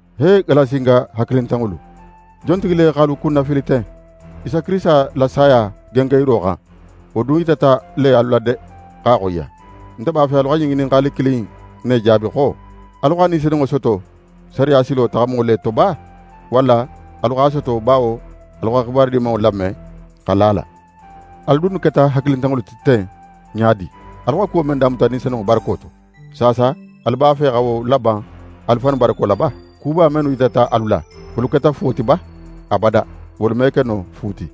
He Galasinga hakilintanŋolu! Jontigi le x'alu kunnafili ten? Isa Kirisita la saya gengenyiro xan, wo dun yitata le alu la de x'a xoyiya! Nte b'a fe alu xa ɲin ŋininxali kilin in ne jaabi xo: Alu xa Ni Senunŋo soto sariya silo taxamo le to ba, walla alu x'a soto bawo alu xa xibaru Dimanŋo lame xa la a la? Alu dunnu keta hakilintanŋolu ti ten ɲa di? Alu xa kuwo men damuta Ni Senunŋo barako to, saasa alu b'a fe xa wo laban alu fannu barako la ba? Kuba mennu yitata alu la, wolu keta fuwo ti ba? Abada! Wolu me ke no fu ti.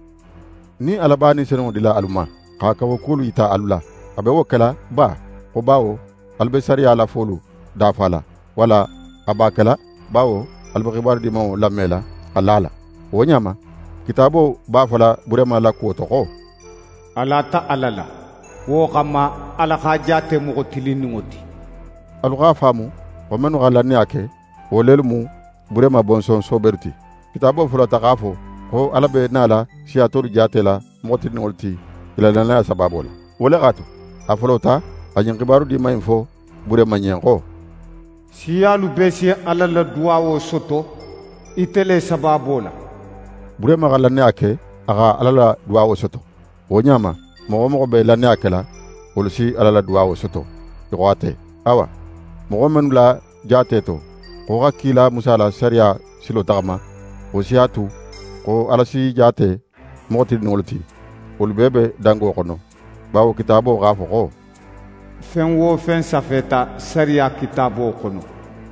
Nin Ala b'a Ni Senunŋo dila alu ma, xa kawakuwolu yita alu la, a be wo kela ba xo bawo alu be sariya la folu dafala, walla a b'a kela bawo alu be Xibaru Dimanŋo lamela xa la a la? Wo ɲa ma, Kitaabo b'a fola Burehima la kuwo to xo: «A lata Ala la, wo xanma Ala x'a jaate moxo tilinninŋo ti.» Alu a faamu xo mennu xa lannaya ke, wo lelu mu Burehima bonson soobelu ti. Kitaabo folota x'a fo xo Ala be nala siya tolu jaatela moxo tilinninŋolu ti i la lannaya le sabaabo la. Wo le x'a tu, a folota xa ɲin xibaru diman in fo Burehima ɲen xo: «Siyalu bee si Ala la duwawo soto ite le sabaabo la.» Burehima xa lannaya ke, a xa Ala la duwawo soto. Wo ɲa ma, moxo wo moxo be lannaya kela, wolu si Ala la duwawo soto í xo ate. Awa, moxo mennu la jaate to, xo xa kila Musa la sariya silo taxama, wo si a tu xo Ala s'i jaate moxo tilinninŋolu ti, wolu bee be dango xono; bawo Kitaabo x'a fo xo: «Fen wo fen safeta sariya Kitaabo xono,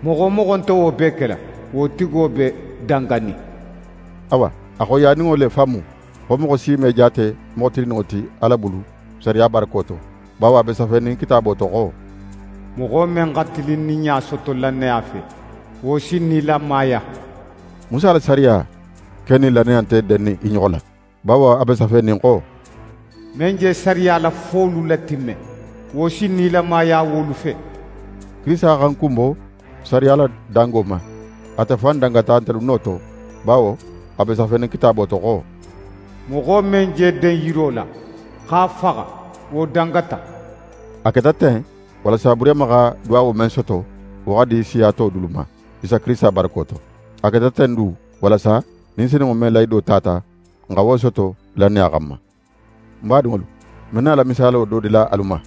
moxo wo moxo nte wo bee kela, wo tigo be danganin.» Awa, a xoyiyaninŋo le fan mu, xo moxo si me jaate moxo tilinninŋo ti Ala bulu sariya barako to; bawo a be safenin Kitaabo to xo: «Moxo men xa tilinninɲa soto lannaya fe, wo si nilamaya.» Musa la sariya ken nin lannaya nte dennin i ɲoxo la. Bawo a be safenin xo: «Men je sariya la folu latimme, wo si nilamaya wolu fe.» Kirisita xa n kunbo sariya la dangalo ma. Ate fan dangata ntelu no to, bawo a be safenin Kitaabo to xo: «Moxo men je den yiro la, x'a faxa, wo dangata.» A keta ten, walasa Burehima xa duwawo men soto, wo xa di siya to dulu ma, Isa Kirisita barako to. A keta ten du, walasa Ni Senunŋo men lahido tata, n xa wo soto lannaya xanma. Ń badinŋolu, ń be nala misaalo do dila alu ma,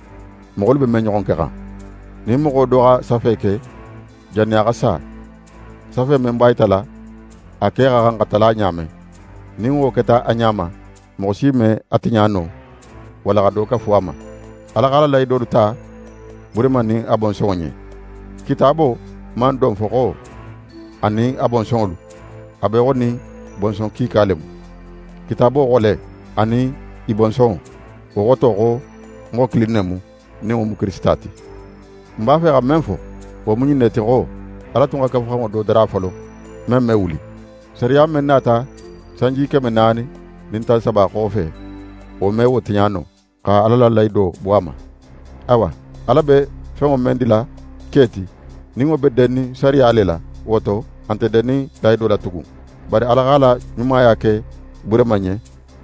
moxolu be men ɲoxon kexan. Nin moxo do xa safe ke jannin a xa sa, safe men b'a yitala a ke xa xan xa tala ɲa men, nin wo keta a ɲa ma, moxo si me a tiɲa no, walla xa do kafu a ma. Ala x'a la lahidolu ta Burehima nin a bonsonŋo ɲen. Kitaabo man don fo xo: «anin a bonsonŋolu», a be í xo nin bonson kiika le mu. Kitaabo xo le: «anin í bonsonŋo». Wo xoto xo moxo kilin ne mu, nin wo mu Kirisita ti. Ń b'a fe xa men fo, wo mu ɲin ne ti xo: Ala tun xa Kafuxanŋo do dara folo, men me wuli. Sariya men nata sanji keme naani nin tan saba xofe, wo me wo tiɲa no, xa Ala la lahido bo a ma. Awa, Ala be fenŋo men dila ke ti, nin wo be dennin sariya le la, wo to a nte dennin lahido la tugun. Bari Ala x'a la ɲumaya ke Burehima ɲen,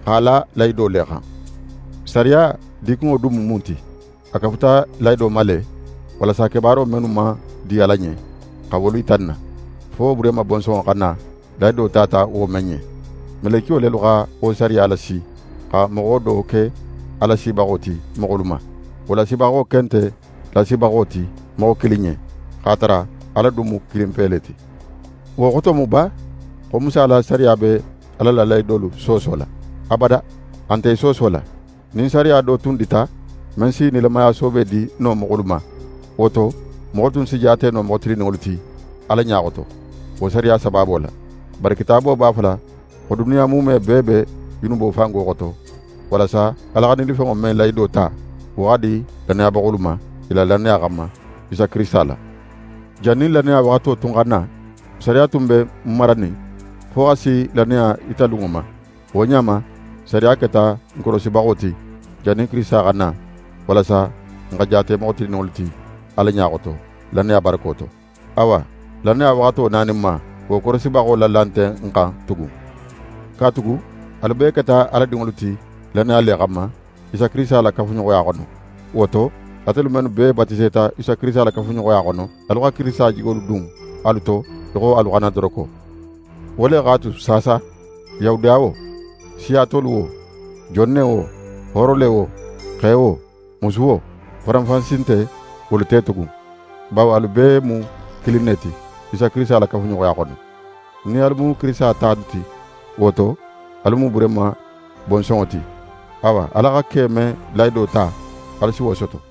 x'a la lahido le xan. Sariya dikunŋo dun mu mun ti? A kafuta lahido ma le, walasa kebaaro mennu man di Ala ɲen, xa wolu yita n na, fo Burehima bonsonŋo xa na, lahido tata wo men ɲen. Melekiyo lelu xa wo sariya lasi, xa moxo do ke a lasibaxo ti moxolu ma. Wo lasibaxo ken nte lasibaxo ti moxo kilin ɲen, x'a tara Ala dun mu kilinpe le ti. Wo xoto mu ba xo Musa la sariya be Ala la lahidolu soosola? Abada! A nte i soosola. Nin sariya do tun dita, men si nilamaya soobe di no moxolu ma, wo to, moxolu tunnu si jaate no moxo tilinninŋolu ti Ala ɲa xoto, wo sariya sabaabo la. Bari Kitaabo b'a fola xo duniya muume bee be junubo fango xoto, walasa Ala xa nilifenŋo men lahido ta, wo xa di lannayabaxolu ma, i la lannaya xanma, Isa Kirisita la. Jannin lannaya waxato tun xa na, sariya tun be n maranin, fo xa si lannaya yitalunŋo ma. Wo ɲa ma, sariya keta n korosibaxo ti, jannin Kirisita xa na; walasa n xa jaate moxo tilinninŋolu ti Ala ɲa xoto, lannaya barako to. Awa, lannaya la waxato naninma, wo korosibaxo la la nte n xan tugun. Katugu alu bee keta Ala dinŋolu ti lannaya le xanma, Isa Kirisita la kafuɲoxoya xono. Wo to, atelu mennu bee batiseta Isa Kirisita la kafuɲoxoya xono, alu xa Kirisita jigolu dun alu to í xo alu xannadoroko. Wo le x'a tu saasa, Yahudiya wo, siya tolu wo, jon ne wo, hooro le wo, xe wo, musu wo, faranfansi nte wolu te tugun, bawo alu bee mu kilin ne ti, Isa Kirisita la kafuɲoxoya xono. Nin alu mu Kirisita talu ti, wo to, alu mu Burehima bonsonŋo ti. Awa, Ala xa ke men lahido ta, alu si wo soto.